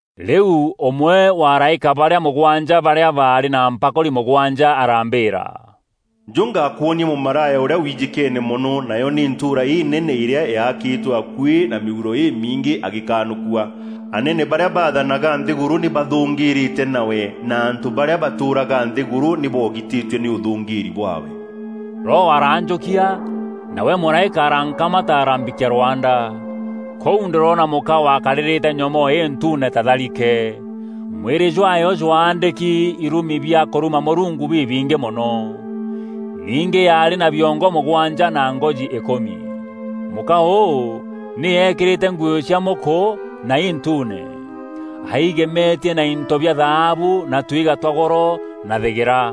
Rîu ûmwe wa araîka barîa mûgwanja barîa baarî na mpakûri mûgwanja arambîîra, “Njû ngakwonie mûmaraya ûrîa wijîkeene mono, nayo nî ntûûra înene îrîa yaakîtwe akuî na mîuro îmiingî, agîkanûkua. Anene barîa bathanaga nthîgûrû nî bathûngîîrîte nawe na antû barîa batûûraga nthîgûrû nî bogitîtue nî ûthûngîîri bwaawe.” Roho aranjûkia, nawe mûraîka arankamata arambikia rwanda. Kûu ndîroona mûka wakarîrîte nyomoo întuune ta tharike. Mwîrî jwaayo jwaandîki irumi bia kûruma Mûrungu bibingî mono. Ningî yaarî na biongo mûgwanja na ngoji îkûmi. Mûka ûû nî eekîrîte nguû cia mûkû na intuune. Aigemetie na into bia thaabu na twiga twa goro na thîgîra.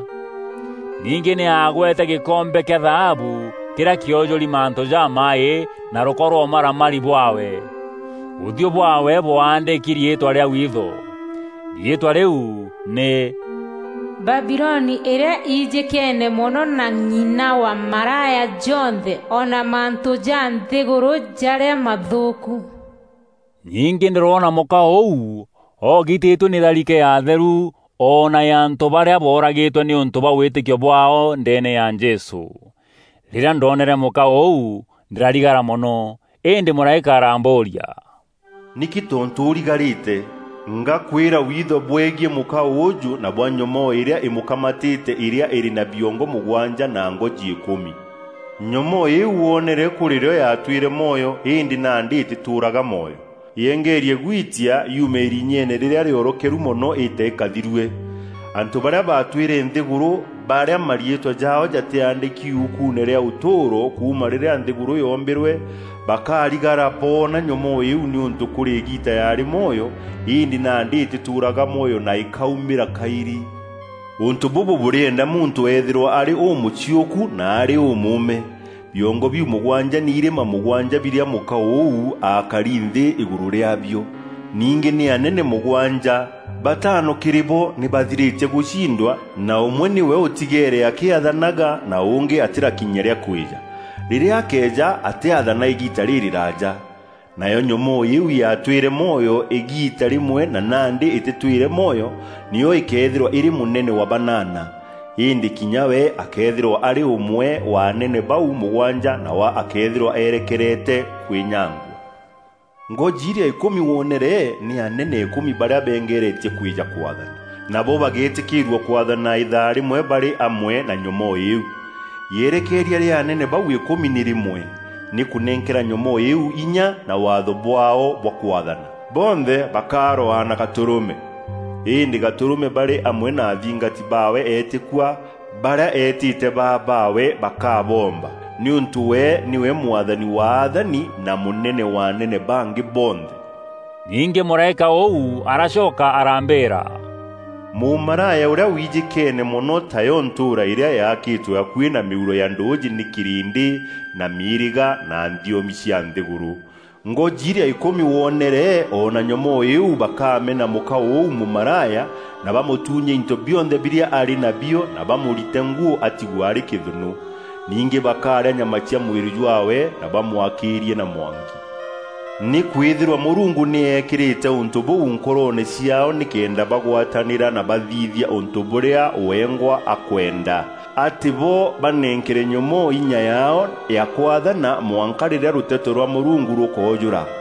Ningî nî aagwete gîkombe kîa thaabu kîrîa kîojûri mantû jamaaî na rûko rwa ûmaramari bwaawe. Ûthiû bwaawe bwaandîki riîtwa rîa witho. Riîtwa rîu nî, “Babiloni îrîa ijîkeene mono na ng'ina wa maraya jonthe o na mantû ja nthîgûrû jarîa mathûûku.” Ningî ndîroona mûka ûu oogitîtue nî tharike ya atheru o na ya antû barîa booragîtwe nîûntû bwa wîtîkio bwaao ndeene ya Jesû. Rîrîa ndoonere mûka ûu ndîrarigara mono. Îndî mûraîka arambûûria, “Nîkî tontû ûrigarîte? Ngakwîra witho bwegiî mûka ûûjû na bwa nyomoo îrîa îmûkamatîte îrîa îrî na biongo mûgwanja na ngoji îkûmi. Nyomoo îîu wonere kûrîrîo yaatwîre mwoyo îndî nandî îtîtûûraga mwoyo. Yengeerie gwitia yuume îrinyeene rîrîa rîorokeru mono îîte îkathirue. Antû barîa batwîre nthîgûrû, barîa mariîtwa jaao jatîaandîki yukuune rîa ûtûûro kuuma rîrîa nthîgûrû yoombîrwe, bakarigara boona nyomoo îîu nîûntû kûrî îgiita yaarî mwoyo îndî nandî îtîtûûraga mwoyo na îkaumîra kaîrî. “Ûntû bûbû bûrîenda muntû eethîrwa arî ûmûciûku na arî ûmûûme. Biongo biu mûgwanja nî irîma mûgwanja birîa mûka ûu akari nthî îgûrû rîaabio. Ningî nî anene mûgwanja; batano kîrî bo nî bathirîtie gûcindwa na ûmwe nîwe ûtigeere akîathanaga na ûngî atîrakinyia rîa kwîja. Rîrîa akeeja atîathana îgiita rîrîraaja. Nayo nyomoo îîu yaatwîre mwoyo îgiita rîmwe na nandî îtîtwîre mwoyo, nîyo îkeethîrwa îrî mûnene wa banana. Îndî kinya we akeethîrwa arî ûmwe wa anene bau mûgwanja nawe akeethîrwa eerekerete kwînyangua. “Ngoji irîa îkûmi wonere nî anene îkûmi barîa bengeerie kwîja kwaathana. Nabo bagetîkîîrua kwaathana îthaa rîmwe barî amwe na nyomoo îîu. Yerekeeria rîa anene bau îkûmi nî rîmwe: nî kûnenkera nyomoo îîu inya na waatho bwaao bwa kwaathana. Bonthe bakarwaa na Gatûrûme. Îndî Gatûrûme, barî amwe na athingati baawe eetîkua, barîa eetîte baa baawe, bakaboomba, nîûntû we nîwe Mwathani wa athani na mûnene wa anene bangî bonthe.” Ningî mûraîka ûu aracoka arambîîra, “Mûmaraya ûrîa wijîkeene mono, tayo ntûûra îrîa yaakîtwe akuî na mîuro ya ndûûjî nî kîrîndî na mîîrîga na nthiomi cia nthîgûrû. Ngoji irîa îkûmi wonere o na nyomoo îîu bakamena mûka ûu mûmaraya na bamûtuunye into bionthe birîa arî nabio na bamûrite nguû atigwe arî kîthûnû. Ningî bakarîa nyama cia mwîrî jwaawe na bamwakîîrie na mwanki. Nîkwîthîrwa Mûrungu nî ekîrîte ûntû bûu nkoroone ciaao nîkenda bagwatanîra na bathithia ûntû bûrîa wengwa akwenda; atî bo banenkere nyomoo inya yaao ya kwaathana mwanka rîrîa rûteto rwa Mûrungu rûkoojûra.